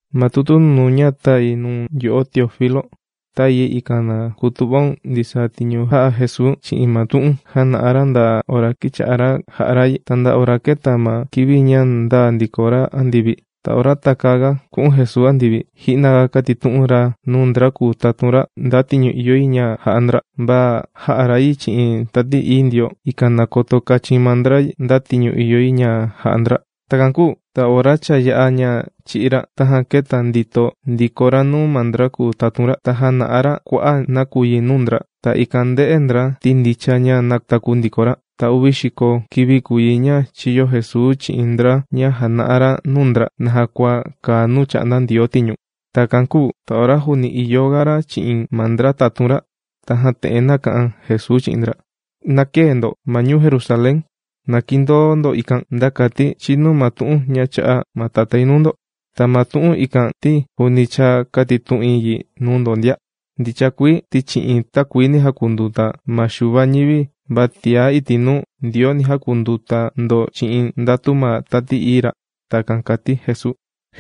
Ma tutu nunuu ña tāi nuu̱n, yo'o Teófilo, tāi yi ikan na kutu'vaun ndisaa tiñu jā'a Jesuu chi'in ma tu'un jāna'a ra nda ora kīcha'a ra jà'a ra yi, ta nda ora kēta ma kivi ña ndāa ndiko ra andivi. Ta ora takäaga ku'un Jesuu andivi, ji'naga kātitu'un ra nuu ndra kùu tatun ra, nda tiñu ìyo yi ña ja'a ndra, va jā'a ra yi chi'in Tati Ií Ndioo, ikan na koto kachin maa ndra yi, nda tiñu ìyo yi ña ja'a ndra. Takan kūu ta ora cha yā'a ña chī'í ra, tajan kēta ndito ndiko ra nuu ma ndra kùu tatun ra, ta jāna'a ra kua'a' nakuyi nuu ndra. Ta ikan ndē'e ndra, ti ndicha ña nātaku ndiko ra. Ta uvi xiko kivi kùu yi ña chīyo Jesuu chi'in ndra ña jàna'a ra nuu ndra, naja kua kàa nuu chà'nda Ndioo tiñu. Takan kūu ta ora juuni ìyo ga ra chi'in ma ndra tatun ra, tajan te'en nāka'an Jesuu chi'in ndra: ―¡Na këe ndo ma ñuu Jerusalén! ¡Na kindoo ndo ikan, nda kati chinu ma tu'un chā'a ma Tatái nuu ndo! Ta ma tu'un ikan, ti juuni cha kātitu'in yi nuu ndo ndia. Ndicha kuii ti chi'in takuini jākunduta ma Xuva ma ñivi, va tiá iti' nuu, Ndioo ni jakunduta ndo chi'in ndatu ma Tati Ií Ra. ―Takan kàti Jesuu.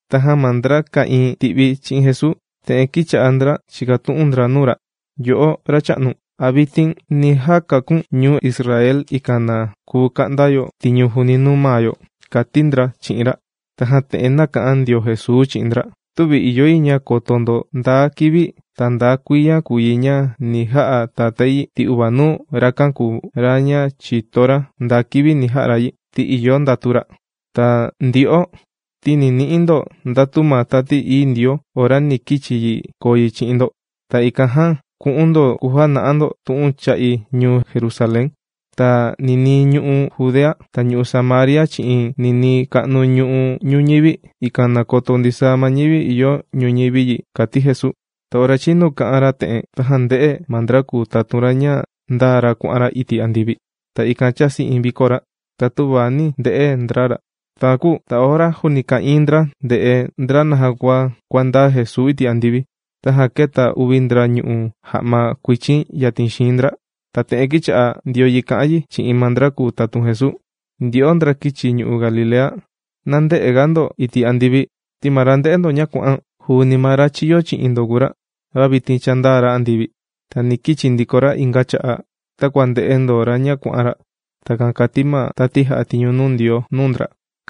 Tajan ma ndra ka'ìin ti'vi chi'in Jesuu, te'en kīcha'a ndra chìkatu'un ndra nuu ra: ―Yo'o, Racha'nu, ¿a vitin ni jakaku̱n ñuu Israel, ikan na kuu ka'nda yo tiñu juuni nuu maa yo? ―kàti ndra chi'in ra. Tajan te'en nāka'an ndio Jesuu chi'in ndra: ―Tüvi ìyo yi ña koto ndo nda kivi, ta nda kuiya kùu yi ña ni ja'a Tatái yi, ti uvanuu rakan kùu ra ña chìto ra nda kivi ni ja'a ra yi, ti ìyo ndatu ra. Ta ndyo'o ti ni ni'i ndo ndatu ma Tati Ií Ndioo ora ni kichi yi koo yi chi'in ndo. Ta ikan jan ku'un ndo kujana'a ndo tu'un cha'i ñuu Jerusalén, ta ninii ñu'u' Judea, ta ñu'u' Samaria chi'in ninii ka'nu ñu'u' ñuñivi, ikan na koto ndisaa ma ñivi ìyo ñuñivi yi ―kàti Jesuu. Ta ora chīnu kà'an ra te'en, tajan ndē'e ma ndra kùu tatun ra ña ndāa ra kuà'an ra iti' andivi. Ta ikan chāsi iin viko ra, ta tüva nī nde'e ndra ra. Takan kūu, ta ora juuni ka'ìin ndra ndè'e ndra naja kua kuàndaa Jesuu iti' andivi, tajan kēta uvi ndra ñù'u ja'ma kuichin yatin xiin ndra, ta te'en kīcha'a ndio yi kà'an yi chi'in ma ndra kùu tatun Jesuu: ―Ndyo'o ndra kīchi ñu'u' Galilea, ¡na ndë'ega ndo iti' andivi! Ti ma ra ndē'e ndo ña kuà'an, juuni ma ra chīyo chi'in ndo kùu ra, va vitin cha ndāa ra andivi. Ta ni kichi ndiko ra inga cha'a', takua ndē'e ndo ra ña kuà'an ra. ―Takan kàti ma tati jà'a tiñu nuu Ndioo nuu ndra.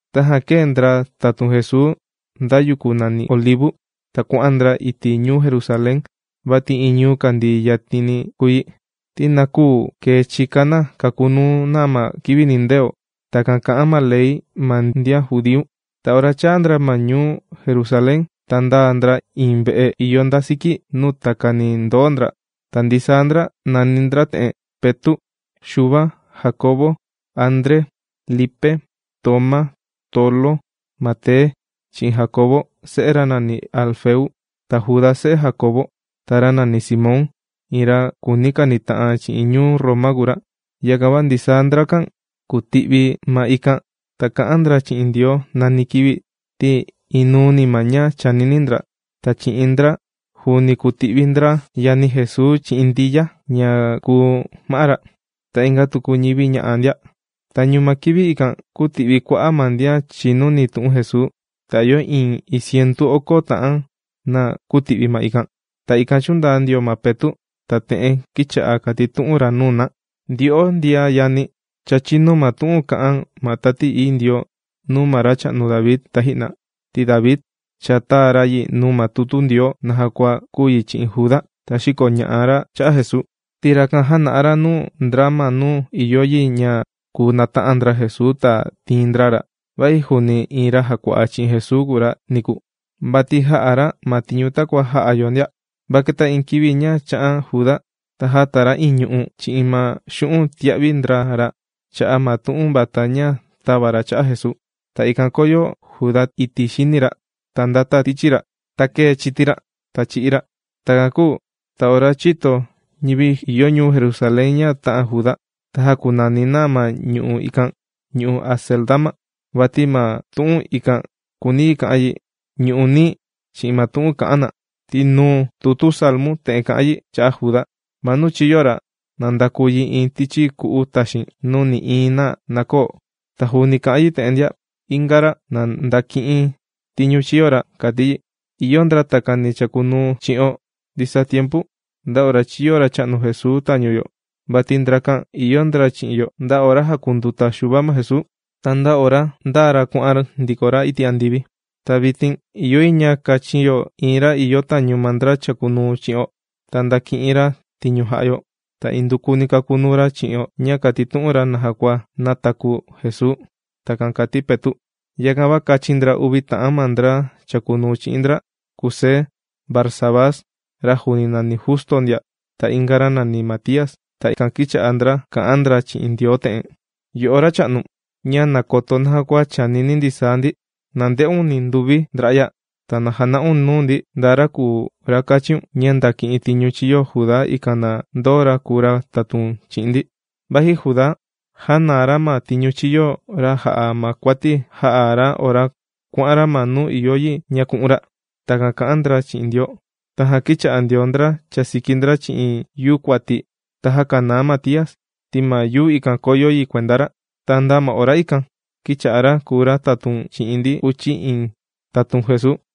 Tajan kēe ndra tatun Jesuu nda yuku nàni Olivu. Ta kuà'an ndra iti' ñuu Jerusalén vati iin ñuu kàndii yatini kùu yi, ti na küu kee chika na kakunuu na ma kivi nindeo, takan kà'an ma ley ma ndian judíu. Ta ora chāa ndra ma ñuu Jerusalén, ta ndāa ndra iin ve'e ìyo nda siki nuu takani ndòo ndra. Ta ndisaa ndrakan, nàni ndra te'en: Petu', Xuva, Jandiau, André, Lipe, Tomá, Tolo, Mate, chi'in Jandiau se'e ra nàni Alfeu, ta Juda se'e Jandiau, ta ra nàni Simón, iin ra kùuni kanita'an chi'in ñuu Roma kùu ra. Yakan va ndisaa ndrakan kùti'vi ma ikan ta kà'an ndra chi'in Ndioo nani kivi ti inuuni ma ña chànini ndra. Ta chi'in ndra juuni kùti'vi ndra yani Jesuu chi'in Ndiya ña kùu ma'á ra, ta inga tuku ñivi ña'a ndia. Tañu ma kivi ikan, kūti'vi kua'a' ma ndian chìnuni tu'un Jesuu. Ta ìyo iin iin cientu oko ta'an na kūti'vi ma ikan. Ta ikan chūndaa ndio ma Petu', ta te'en kīcha'a kàtitu'un ra nuu na: ―Ndyo'o ndian yani, cha chīnu ma tu'un kā'an ma Tati Ií Ndioo nuu ma racha'nu David taji'na. Ti David, cha tāa ra yi nuu ma tutu Ndioo naja kua kūu yi chi'in Juda, ra xīkoña'a cha'a' Jesuu. Ti rakan jāna'a ra nuu ndra ma nuu ìyo yi ña kùu nata'an ndra Jesuu ta tiin ndra ra, vaji juuni iin ra jàkua'a chi'in Jesuu kùu ra niku. Vati jā'a ra ma tiñu takua jà'a yo ndia. Va kēta iin kivi ña chā'an Juda, ta jāta ra iin ñu'u' chi'in ma xu'un' tīa'vi ndra ra cha'a' ma tu'un vata ña tāva ra cha'a' Jesuu. Ta ikan kōyo Juda iti' xini ra, ta ndāta tichi ra. Ta kēe chiti ra, ta chī'í ra. Takan kūu ta ora chīto ñivi ìyo ñuu Jerusalén ña tā'an Juda, ta jākunani na ma ñu'u' ikan, Ñu'u' Acéldama, vati ma tu'un ikan kùuni yi ka'an yi: Ñu'u' Nií chi'in ma tu'un kà'an na. Ti nuu tutu Salmu te'en kà'an yi cha'a' Juda: Ma nuu chīyo ra, na ndakuu yi iin tichi ku'u taxiin, nuu nï'iin na na köo. Ta juuni kà'an yi te'en ndia: Inga ra, na ndaki'in tiñu chīyo ra, kàti yi. ’Ìyo ndra takani chàkunuu chi'o ndisaa tiempu, nda ora chīyo Racha'nu Jesuu tañu yo. Vati ndrakan ìyo ndra chi'in yo, nda ora jākunduta Xuva ma Jesuu, ta nda ora ndāa ra kuà'an ndiko ra iti' andivi. Ta vitin ìyo yi ña kachin yo iin ra ìyo tañu ma ndra chàkunuu chi'o, ta ndaki'in ra tiñu jà'a yo. Ta indukuni kakunuu ra chi'o ña kàtitu'un ra naja kua nātaku Jesuu. ―Takan kàti Petu'. Yakan va kāchin ndra uvi ta'an ma ndra chàkunuu chi'in ndra: Kusé Barsabás, ra juuni nàni Justo ndia, ta inga ra nàni Matías. Ta ikan kīcha'a ndra kà'an ndra chi'in Ndioo te'en: ―Yo'o Racha'nu ña nàkoto naja kua chànini ndisaa ndi. Na nde'un ninduvi ndra'ya, ta na jana'un nuu ndi nda ra kùu ra kàchíun, ña ndaki'in tiñu chīyo Juda, ikan na ndoo ra kùu ra tatun chi'in ndi. Vati Juda jānaa ra ma tiñu chīyo ra jà'a ma kuati jā'a ra ora kuà'an ra ma nuu ìyo yi ña ku'un ra. ―Takan kà'an ndra chi'in Ndioo. Tajan kīcha'a ndio ndra chàsiki ndra chi'in yuu kuati, ta jākanaa Matías, ti ma yuu ikan kōyo yi kuenda ra. Ta nda ma ora ikan kīcha'a ra kùu ra tatun chi'in ndi uchi iin tatun Jesuu.